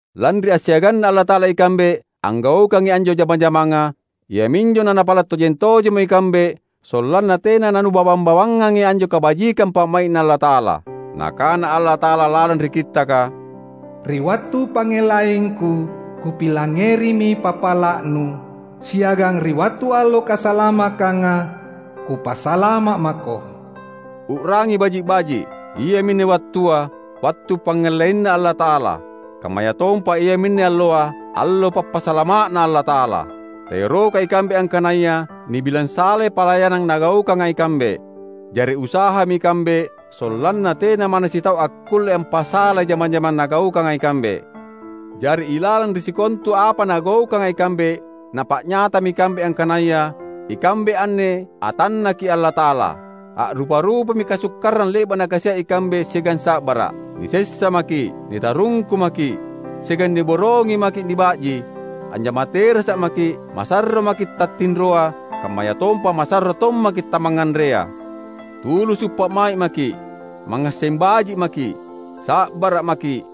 Lanri assiaganNa Allata’ala ikambe anggaukangi anjo jama-jamanga, iami anjo nanapala’ tojeng-tojemmo ikambe sollanna tena nanubawang-bawangangi anjo kabajikang pa’mai’Na Allata’ala. Nakana Allata’ala lalang ri Kittaka, "Ri wattu pangngellaingKu, Kupilangngerimi pappala’nu, siagang ri wattu allo kasalamakkanga, Kupasalama’ mako." U’rangi baji’-baji’! Iaminne wattua, wattu pangngellaiNa Allata’ala. Kammayatompa iaminne alloa, allo pappasalama’Na Allata’ala. Taerokai ikambe angkanaya nibilang salai palayanang nagaukanga ikambe. Jari usahami ikambe sollanna tena manna sitau akkulle ampasalai jama-jamang nagaukanga ikambe. Jari ilalang ri sikontu apa nagaukanga ikambe napa’nyatami ikambe angkanaya ikambe anne atanNaki’ Allata’ala. A’rupa-rupami kasukkarang le’ba’ nakasia’ ikambe siagang sa’bara’: nisessa maki’, nitarungku maki’, siagang niborongi maki’ niba’ji; anjama terasa’ maki’, masarro maki’ tattinroa, kammayatompa masarro tommaki’ tamangnganrea. Tulusu’ pa’mai’ maki’, mangngasseng baji’ maki’, sa’bara’ maki’,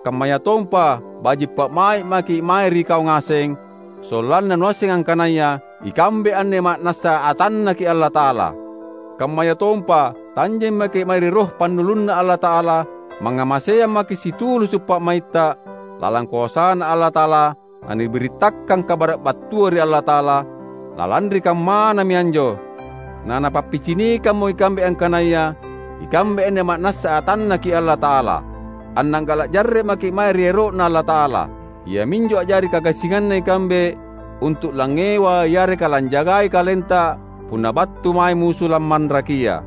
kammayatompa baji’ pa’mai’ maki’ mae ri kau ngaseng, sollanna nuasseng angkanaya ikambe anne ma’nassa atanNaki’ Allata’ala. Kammayatompa tanjeng maki’ mae ri Roh pannulunNa Allata’ala, mangngamaseang maki’ situlusu’ pa’maitta; lalang koasaNa Allata’ala nanibirittakang kabara’ battua ri Allata’ala; na lanri kammanami anjo nanapappicinikammo ikambe angkanaya ikambe anne ma’nassa atanNaki’ Allata’ala. Anna’gala’ jarre’ maki’ mae ri ero’Na Allata’ala. Iaminjo a’jari kagassinganna ikambe untu’ langngewa yareka lanjagai kalenta punna battu mae musu lammanrakia.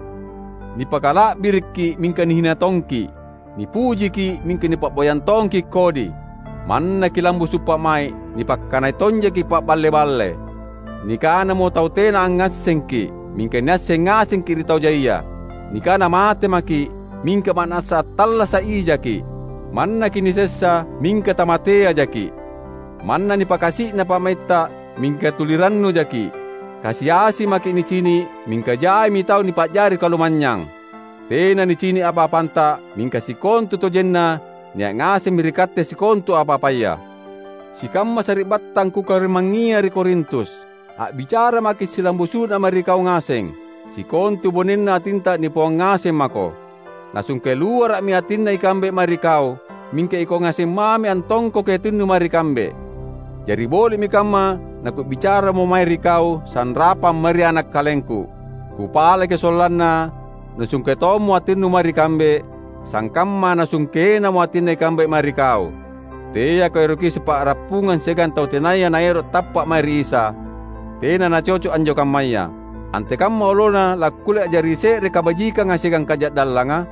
Nipakala’birikki’ mingka nihina tongki’; nipujiki’ mingka nipa’boyang tongki’ kodi. Manna kilambusu’ pa’mai’, nipakkanai tonjaki’ paballe-balle. Nikanamo tau tena angngassengki’, mingka niasseng ngasengki’ ri tau jaia. Nikana mate maki’, mingka ma’nassa attallasa’ ijaki’. Manna kinisessa, mingka tamateajaki’. Manna nanipakasi’na pa’maitta, mingka tuli rannujaki’. Kasi-asi maki’ nicini’, mingka jaimi tau nipa’jari kalumanynyang. Tena nicini’ apa-apanta, mingka sikontutojenna nia’ ngasemmi ri katte sikontu apa-apaya. Sikamma sari’battang kukarimangngia ri Korintus! A’bicara maki’ silambusu’na mae ri kau ngaseng. Sikontu bonena atinta nipauang ngaseng mako. Nasungke luara’mi atinna ikambe mae ri kau, mingka ikau ngaseng mami antongkoki atinnu mae ri kambe. Jari boli’mi kamma naku’bicaramo mae ri kau sanrapang mae ri ana’ kalengku. Kupalaki sollanna nusungke tommo atinnu mae ri kambe, sangkamma nasungkenamo atinna ikambe mae ri kau. Teako eroki sipa’rappungang siagang tau tenaya naero’ tappa’ mae ri Isa; tena nacoco’ anjo kammaya. Antekamma olona lakkulle a’jari se’re kabajikanga siagang kaja’dallanga?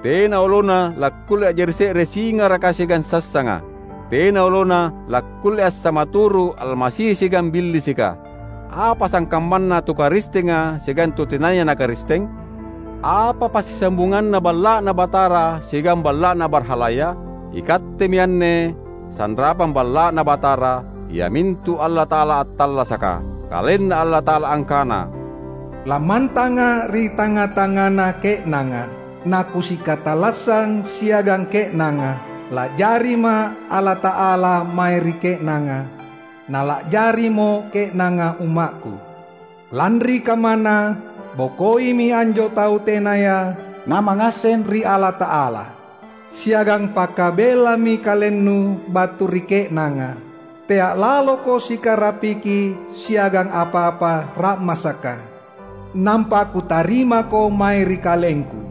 Tena olona lakkulle a’jari se’re singaraka siagang sassanga. Tena olona lakkulle assamaturu’ Almasi siagang Billisika. Apa sangkammanna tu Karistenga siagang tu tenaya na Karisteng? Apa passisambunganna Balla’Na Batara siagang balla’na barhalaya? Ikattemi anne sanrapang Balla’Na Batara, iamintu Allata’ala attallasaka. KalenNa Allata’ala angkana, "LammantangA’ ri tangnga-tangngana ke’nanga, na Kusikatallassang siagang ke’nanga. La’jariMa’ Allata’ala mae ri ke’nanga, na la’jarimo ke’nanga ummakKu. Lanri kammana, bokoimi anjo tau tenaya namangngasseng ri Allata’ala, siagang pakabellami kalennu battu ri ke’nanga. Tea’ laloko sikarapiki siagang apa-apa ra’masaka, nampa Kutarimako mae ri KalengKu.